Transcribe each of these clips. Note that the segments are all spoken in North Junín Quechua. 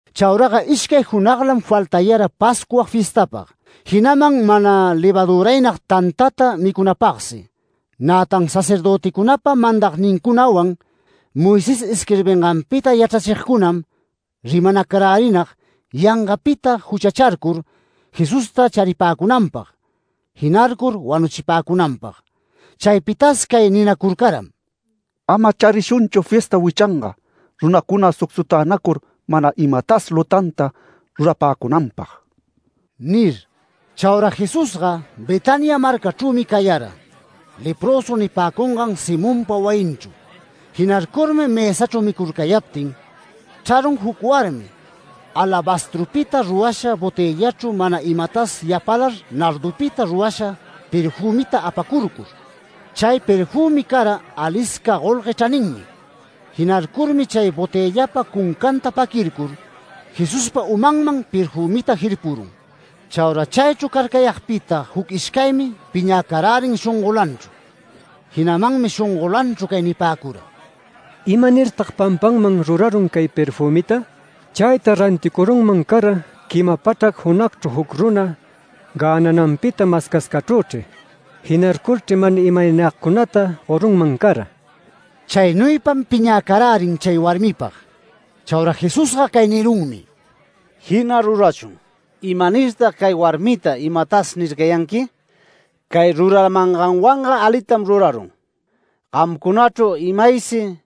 Chauraga ishcay junaglam faltayara Pascua fiestapag, jinaman mana levaduraynag tantata micunapagsi. Nätan sacerdöticunapa mandagnincunawan Moisés isquirbinganpita yachrachigcunam rimanacarärinag yangapita juchacharcur Jesusta charipäcunanpag, jinarcur wanuchipäcunanpag. Chaypitas cay ninacurcaram: “Ama charishunchu fiesta wichanga, runacuna sucsutänacur mana imatas lutanta rurapäcunanpag” nir. Chaura Jesusga Betania marcachrümi cayara, leprösu nipäcungan Simonpa wayinchru. Jinarcurmi mësachru micurcayaptin chrarun juc warmi alabastrupita rurasha botëllachru mana imatas yapalar nardupita rurasha perfümita apacurcur. Chay perfümi cara alisca golgue chraninmi. Jinarcurmi chay botëllapa cuncanta paquircur, Jesuspa umanman perfümita jirpurun. Chaura chaychru carcayagpita juc ishcaymi piñäcarärin shongolanchru. Jinamanmi shongolanchru cay nipäcura: “¿Imanirtag pampanman rurarun cay perfümita? Chayta ranticurunman cara, quima pachrac junagchru juc runa gänananpita mascascachrüchri. Jinarcurchri mana imaynagcunata gorunman cara”. Chaynuypam piñäcarärin chay warmipag. Chaura Jesusga cay nirunmi: “Jina rurachun. ¿Imanirtag cay warmita imatas nircayanqui? Cay ruramanganwanga alitam rurarun. Gamcunachru imaysi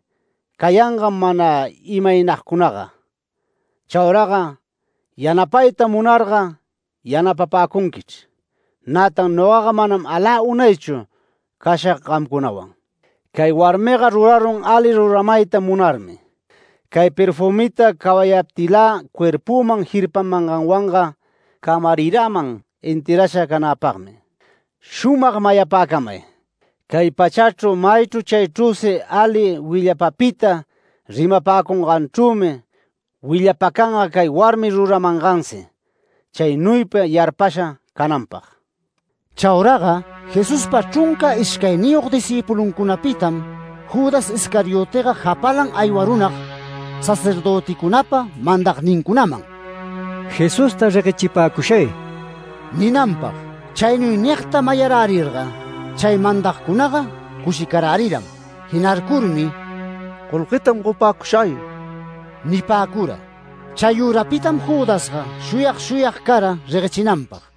cayangam mana imaynagcunaga. Chauraga yanapayta munarga yanapapäcunquichr. Nätan nogaga manam alä unaychu cashag gamcunawan. Cay warmiga rurarun ali ruramayta munarmi. Cay perfümita cawayaptilä cuerpüman jirpamanganwanga camariraman enterrasha canäpagmi. Shumag mayapäcamay: Cay pachachru maychru chaychrüsi ali willapapita rimapäcunganchrümi willapacanga cay warmi ruramangansi, chaynuypa yarpasha cananpag”. Chauraga Jesuspa chrunca ishcayniyog discïpuluncunapitam Judas Iscariotega japalan aywarunag sacerdöticunapa mandagnincunaman “Jesusta reguechipäcushay” ninanpag. Chaynuy nigta mayarärirga chay mandagcunaga cushicaräriram. Jinarcurmi “Golguetam gopäcushay” nipäcura. Chayürapitam Judasga shuyag shuyag cara reguechinanpag.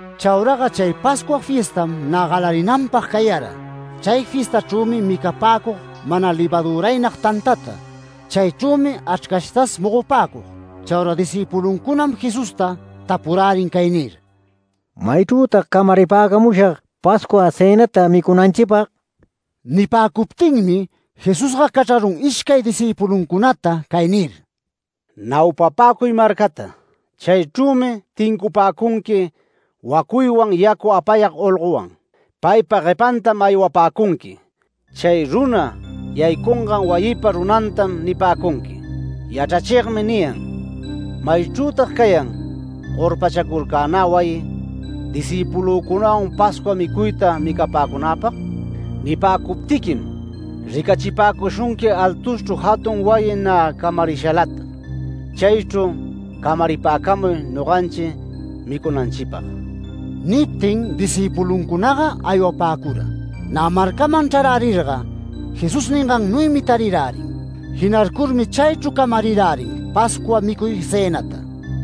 Chauraga chay Pascua fiestam nä galarinanpag cayara, chay fiestachrümi micapäcug mana levaduraynag tantata. Chaychrümi achrcashtas mogopäcug. Chaura discïpuluncunam Jesusta tapurärin cay nir: “¿Maychrütag camaripäcamushag Pascua cënata micunanchipag?” Nipäcuptinmi Jesusga cachrarun ishcay discïpuluncunata cay nir: “Naupapäcuy marcata. Chaychrümi tincupäcunqui wacuywan yacu apayag olgowan. Paypa guepantam aywapäcunqui. Chay runa yaycungan wayipa runantam nipäcunqui: ‘Yachrachigmi niyan, “¿Maychrütag cayan gorpachacurcänä wayi, discïpulücunawan Pascua micuyta micapäcunäpag?” ’ Nipäcuptiquim ricachipäcushunqui altuschru jatun wayita nä camarishalata. Chaychru camaripäcamuy noganchi micunanchipag”. Niptin discïpuluncunaga aywapäcura. Nä marcaman chrarärirga Jesús ningannuymi tarirärin. Jinarcurmi chaychru camarirärin Pascua micuy cënata.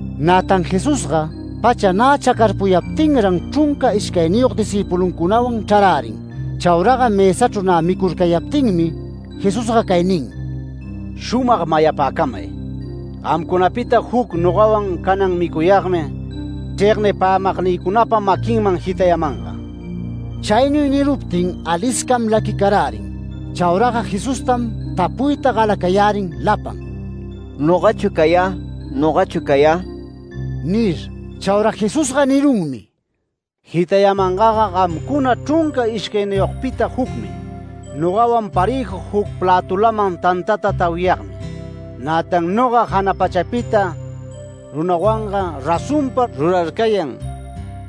Nätan Jesusga pacha nä chacarpuyaptinran chrunca ishcayniyog discïpuluncunawan chrarärin. Chauraga mësachru nä micurcayaptinmi Jesusga cay nin: “Shumag mayapäcamay: Gamcunapita jucmi, nogawan canan micuyagmi chregnipämagnïcunapa maquinman jitayamanga”. Chaynuy niruptin aliscam laquicarärin. Chauraga Jesustam tapuyta galacayärin lapan: “¿Nogachu cayä? ¿Nogachu cayä?” nir. Chaura Jesusga nirunmi: “Jitayamangaga gamcuna chrunca ishcayniyogpita jucmi, nogawan parëju juc plätulaman tantata tawiyagmi. Nätan noga jana pachapita runawanga, razonpa rurarcayan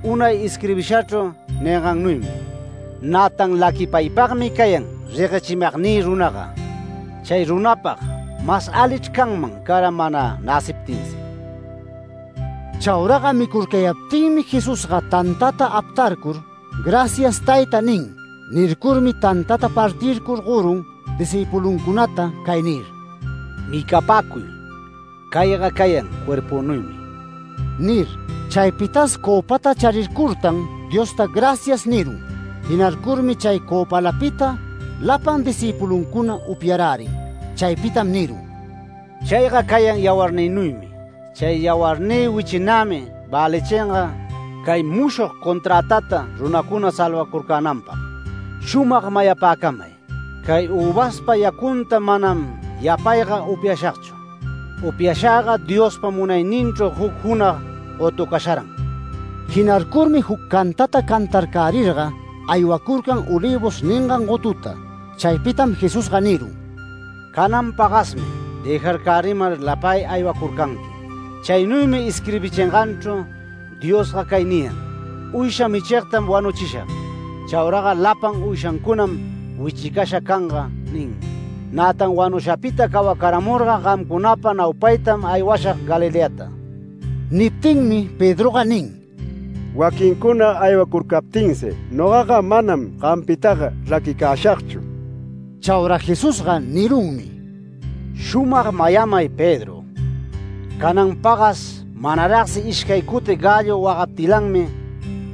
unay isquirbishachru ningannuymi. Nätan laquipaypagmi cayan reguechimagnï runaga. Chay runapag mas alichr canman cara mana näciptinsi”. Chauraga micurcayaptinmi Jesusga tantata aptarcur “Gracias, Tayta” nin. Nircurmi tantata partircur gorun discïpuluncunata cay nir: “Micapäcuy. Cayga cayan cuerpünuymi” nir. Chaypitas cöpata charircurtan Diosta “Gracias” nirun. Jinarcurmi chay cöpalapita lapan discïpuluncuna upyarärin. Chaypitam nirun: “Chayga cayan yawarnïnuymi. Chay yawarnï wichinämi välichinga cay mushog conträtata runacuna salvacurcänanpag. Shumag mayapäcamay: Cay üvaspa yacunta manam yapayga upyashagchu. Upyashagga Diospa munayninchru juc junag gotucasharan”. Jinarcurmi juc cantata cantarcärirga aywacurcan Olivos ningan gotuta. Chaypitam Jesusga nirun: “Canan pagasmi dëjarcärimar lapay aywacurcanqui. Chaynuymi isquirbichinganchru Diosga cay niyan: ‘Uysha michigtam wanuchishag. Chauraga lapan uyshancunam wichicasha canga’ ninmi. Nätan wanushapita cawacaramurga gamcunapa naupaytam aywashag Galileata”. Niptinmi Pedroga nin: “Waquincuna aywacurcaptinsi nogaga manam gampitaga raquicäshagchu”. Chaura Jesusga nirunmi: “Shumag mayamay Pedro: Canan pagas manaragsi ishcay cuti gallo wagaptilanmi,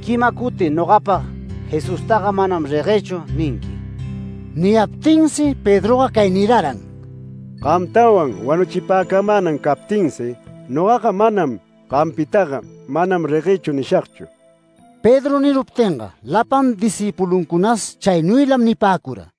quima cuti nogapag Jesustaga ‘Manam reguëchu’ ninqui”. Niyaptinsi Pedroga cay niraran: “Gamtawan wanuchipäcamänan captinsi, ¡nogaga manam gampitaga ‘Manam reguëchu’ nishagchu!” Pedro niruptinga lapan discïpuluncunas chaynuylam nipäcura.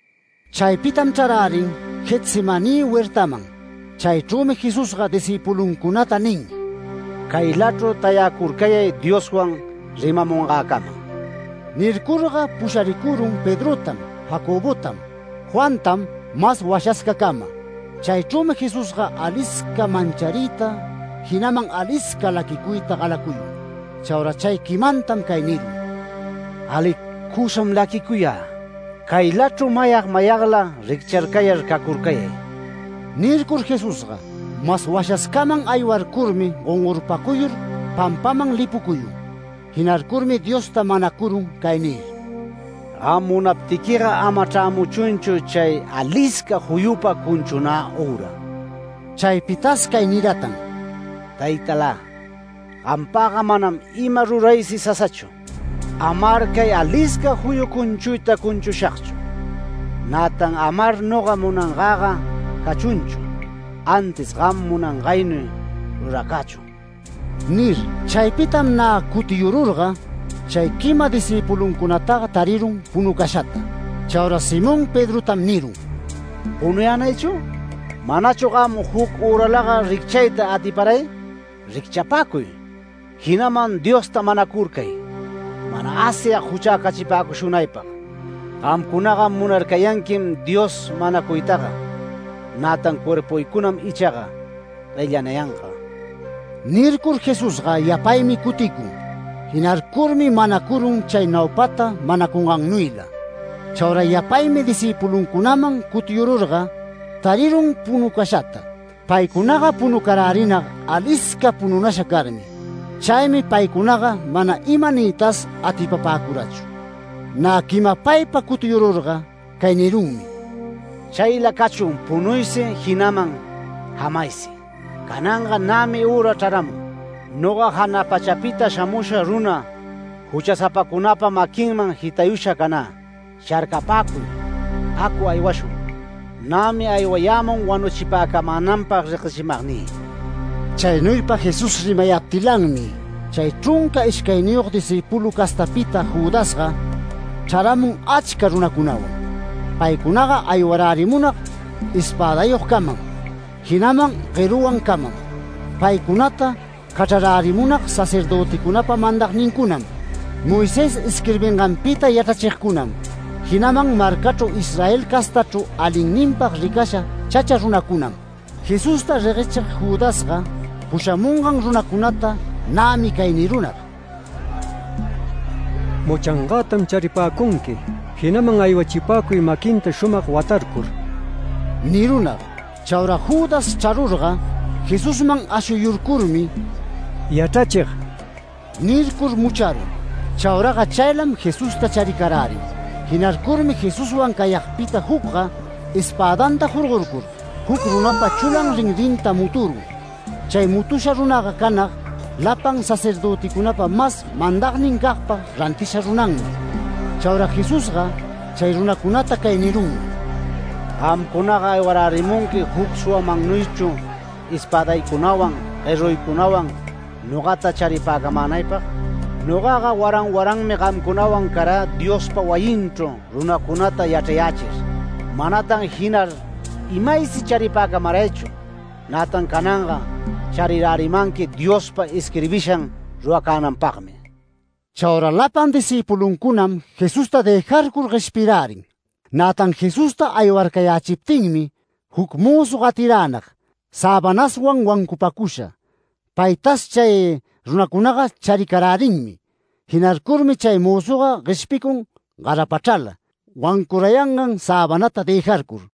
Chaypitam chrarärin Getsemaní huertaman. Chaychrümi Jesusga discïpuluncunata nin: “Caylachru tayacurcayay Dioswan rimamungäcama”. Nircurga pusharicurun Pedrotam, Jacobotam, Juantam mas washascacama. Chaychrümi Jesusga alisca manchariyta, jinaman alisca laquicuyta galacuyun. Chaura chay quimantam cay nirun: “Alicusam laquicuyä. Caylachru mayag mayagla riccharcayar cacurcayay”. Nircur Jesusga mas washascaman aywarcurmi gongorpacuyur pampaman lipucuyun. Jinarcurmi Diosta manacurun cay nir: “Gam munaptiquiga ama chrämuchunchu chay alisca juyupa cunchunä üra”. Chaypitas cay niratan: “Taytalä, gampagga manam ima ruraysi sasachu, amar cay alisca juyu cunchuyta cunchushagchu. Nätan amar noga munangäga cachunchu, antis gam munangaynuy ruracächun” nir. Chaypitam nä cutiyururga chay quima discïpuluncunataga tarirun punucashata. Chaura Simón Pedrotam nirun: “¿Punuyänaychu? ¿Manachu gamga juc üralaga ricchayta atiparay? Ricchapäcuy, jinaman Diosta manacurcay, mana Asyag juchäcachipäcushunaypag. Gamcunaga munarcayanquim Dios manacuytaga, nätan cuerpuycunam ichaga guellanayanga”. Nircur Jesusga yapaymi cuticun. Jinarcurmi manacurun chay naupata manacungannuyla. Chaura yapaymi discïpuluncunaman cutiyururga tarirun punucashata. Paycunaga punucarärinag alisca pununasha carmi. Chaymi paycunaga mana ima niytas atipapäcurachu. Nä quimapaypa cutiyururga cay nirunmi: “Chayla cachun punuysi, jinaman jamaysi. Cananga nämi üra chraramun, noga jana pachapita shamusha runa juchasapacunapa maquinman jitayusha canä. Sharcapäcuy, acu aywashun. Nämi aywayämun wanuchipäcamänanpag reguechimagnï”. Chaynuypa Jesús rimayaptilanmi chay chrunca ishcayniyog discípulu castapita Judasga, chraramun achca runacunawan. Paycunaga aywarärimunag espädayogcamam, jinaman gueruwancamam. Paycunata cachrarärimunag sacerdöticunapa mandagnincunam, Moisés isquirbinganpita yachrachigcunam, jinaman marcachru Israel castachru alinninpag ricasha chacha runacunam. Jesusta reguechig Judasga pushamungan runacunata nämi cay nirunag: “Muchangätam charipäcunqui, jinaman aywachipäcuy maquinta shumag watarcur” nirunag. Chaura Judas chrarurga, Jesusman ashuyurcurmi. “Yachrachig” nircur mucharun. Chauraga chaylam Jesusta charicarärin. Jinarcurmi Jesuswan cayagpita jucga espädanta jorgorcur juc runapa chulam rinrinta muturun. Chay mutusha runaga canag, lapan sacerdöticunapa mas mandagnincagpa rantisha runanmi. Chaura Jesusga chay runacunata cay nirunmi: “Gamcunaga aywarärimunqui juc suwamannuychu, espädaycunawan, gueruycunawan nogata charipäcamänaypag. Nogaga waran waranmi gamcunawan carä Diospa wayinchru runacunata yachrayächir. Manatan jinar imaysi charipäcamaraychu. Nätan cananga charirärimanqui Diospa isquirbishan ruracänanpagmi”. Chaura lapan discïpuluncunam Jesusta dëjarcur gueshpirärin. Nätan Jesusta aywarcayächiptinmi juc mözu gatiränag säbanaswan wancupacusha. Paytas chay runacunaga charicarärinmi. Jinarcurmi chay mözuga gueshpicun garapachrala, wancurayangan säbanata dëjarcur.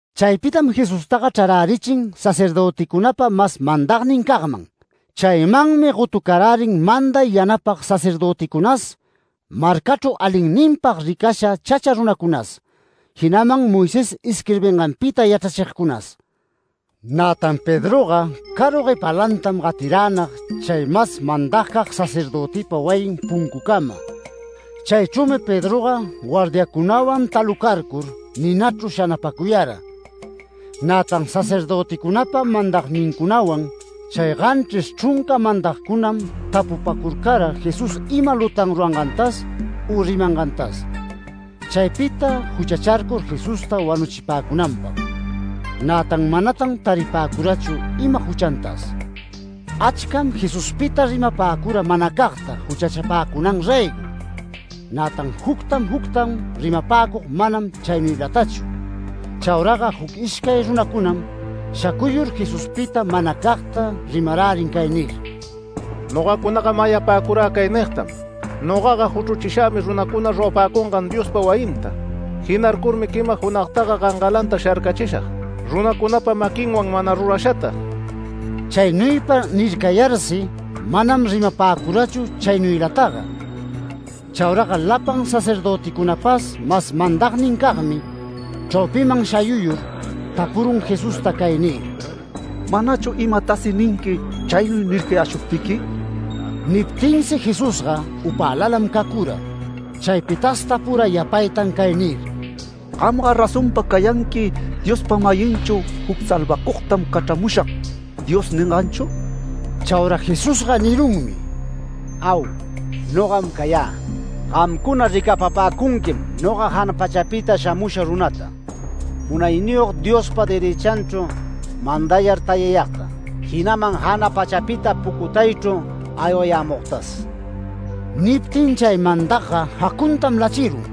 Chaypitam Jesustaga chrarärichin sacerdöticunapa mas mandagnincagman. Chaymanmi gotucarärin manday yanapag sacerdöticunas, marcachru alinninpag ricasha chacha runacunas, jinaman Moisés isquirbinganpita yachrachigcunas. Nätan Pedroga caru guepalantam gatiränag chay mas mandagcag sacerdötipa wayin puncucama. Chaychrümi Pedroga guardiacunaman talucarcur ninachru shanapacuyara. Nätan sacerdöticunapa mandagnincunawan, chay ganchris chrunca mandagcunam tapupacurcara Jesús ima lutan rurangantas u rimangantas, chaypita juchacharcur Jesusta wanuchipäcunanpag. Nätan manatan taripäcurachu ima juchantas. Achcam Jesuspita rimapäcura manacagta juchachapäcunan raygo. Nätan jucta juctam rimapäcug manam chaynuylatachu. Chauraga juc ishcay runacunam shacuyur Jesuspita manacagta rimarärin cay nir: “Nogacunaga mayapäcurä cay nigtam: ‘Nogaga juchruchishagmi runacuna rurapäcungan Diospa wayinta. Jinarcurmi quima junagtaga gangalanta sharcachishag runacunapa maquinwan mana rurashata’”. Chaynuypa nircayarsi manam rimapäcurachu chaynuylataga. Chauraga lapan sacerdöticunapas mas mandagnincagmi, chraupiman shayuyur tapurun Jesusta cay nir: “¿Manachu imatasi ninqui chaynuy nircayäshuptiqui?” Niptinsi Jesusga upälalam cacura. Chaypitas tapura yapaytan cay nir: “¿Gamga razonpa cayanqui Diospa-mayinchu juc ‘Salvacugtam cachramushag’ Dios ninganchu?” Chaura Jesusga nirunmi: “Au, nogam cayä. Gamcuna ricapapäcunquim noga jana pachapita shamusha runata, Munayniyog Diospa derëchanchru mandayar tayayagta, jinaman jana pachapita pucutaychru aywayämugtas”. Niptin chay mandagga jacuntam lachirun,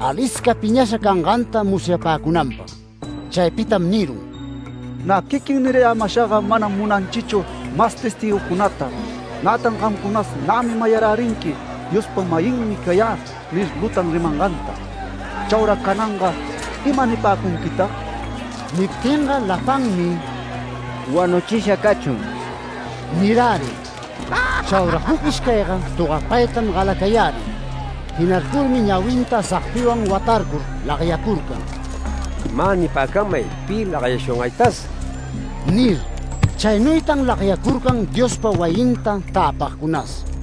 alisca piñasha canganta musyapäcunanpag. Chaypitam nirun: “Nä quiquin nirayämashaga manam munanchichu mas testïgucunata. Nätan gamcunas nämi mayarärinqui ‘Diospa-mayinmi cayä’ nir lutan rimanganta. Chaura cananga ¿ima nipäcunquitag?” Niptinga lapanmi “¡Wanuchisha cachun!” nirärin. Chaura juc ishcayga togapaytam galayärin. Jinarcurmi ñawinta sagpiwan watarcur lagyacurcan, “¡Mä nipäcamay pi lagyashungaytas!” nir. Chaynuytan lagyacurcan Diospa wayinta täpagcunas.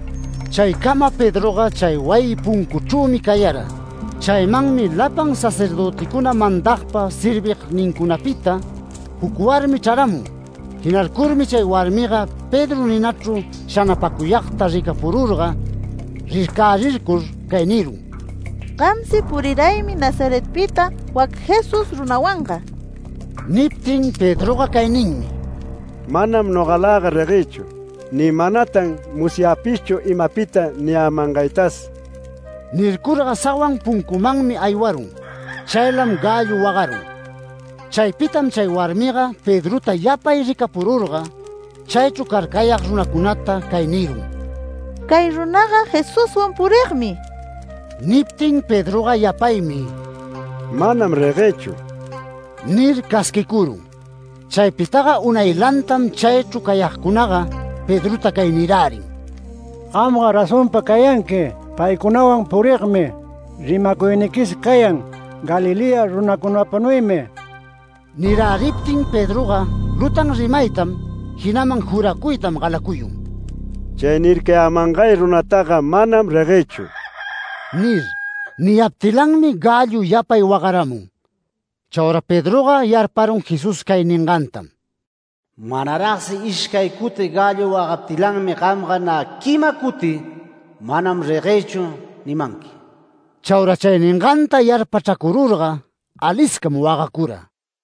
Chaycama Pedroga chay wayi puncuchrümi cayara. Chaymanmi lapan sacerdöticuna mandagpa servignincunapita juc warmi chraramun. Jinarcurmi chay warmiga Pedro ninachru shanapäcuyagta ricapururga, rircärircur cay nirun: “Gamsi puriraymi Nazaretpita wac Jesús runawanga”. Niptin Pedroga cay ninmi: “Manam nogalaga reguëchu, ni manatan musyäpishchu imapita niyämangaytas”. Nircurga sawan puncumanmi aywarun. [Chaylam gallo wagarun.] Chaypitam chay warmiga Pedrota yapay ricapururga, chaychru carcayag runacunata cay nirun: “Cay runaga Jesuswan purigmi”. Niptin Pedroga yapaymi “Manam reguëchu” nir casquicurun. Chaypitaga unaylantam chaychru cayagcunaga Pedrota cay nirärin: “Gamga razonpa cayanqui paycunawan purigmi. Rimacuyniquis cayan Galilea runacunapanuymi”. Niräriptin Pedroga lutan rimaytam, jinaman juracuytam galacuyun, “Chay nircayämangay runataga manam reguëchu” nir. Niyaptilanmi gallo yapay wagaramun. Chaura Pedroga yarparun Jesús cay ningantam: “Manaragsi ishcay cuti gallo wagaptilanmi gamga nä quima cuti ‘Manam reguëchu’ nimanqui”. Chaura chay ninganta yarpachracururga aliscam wagacura.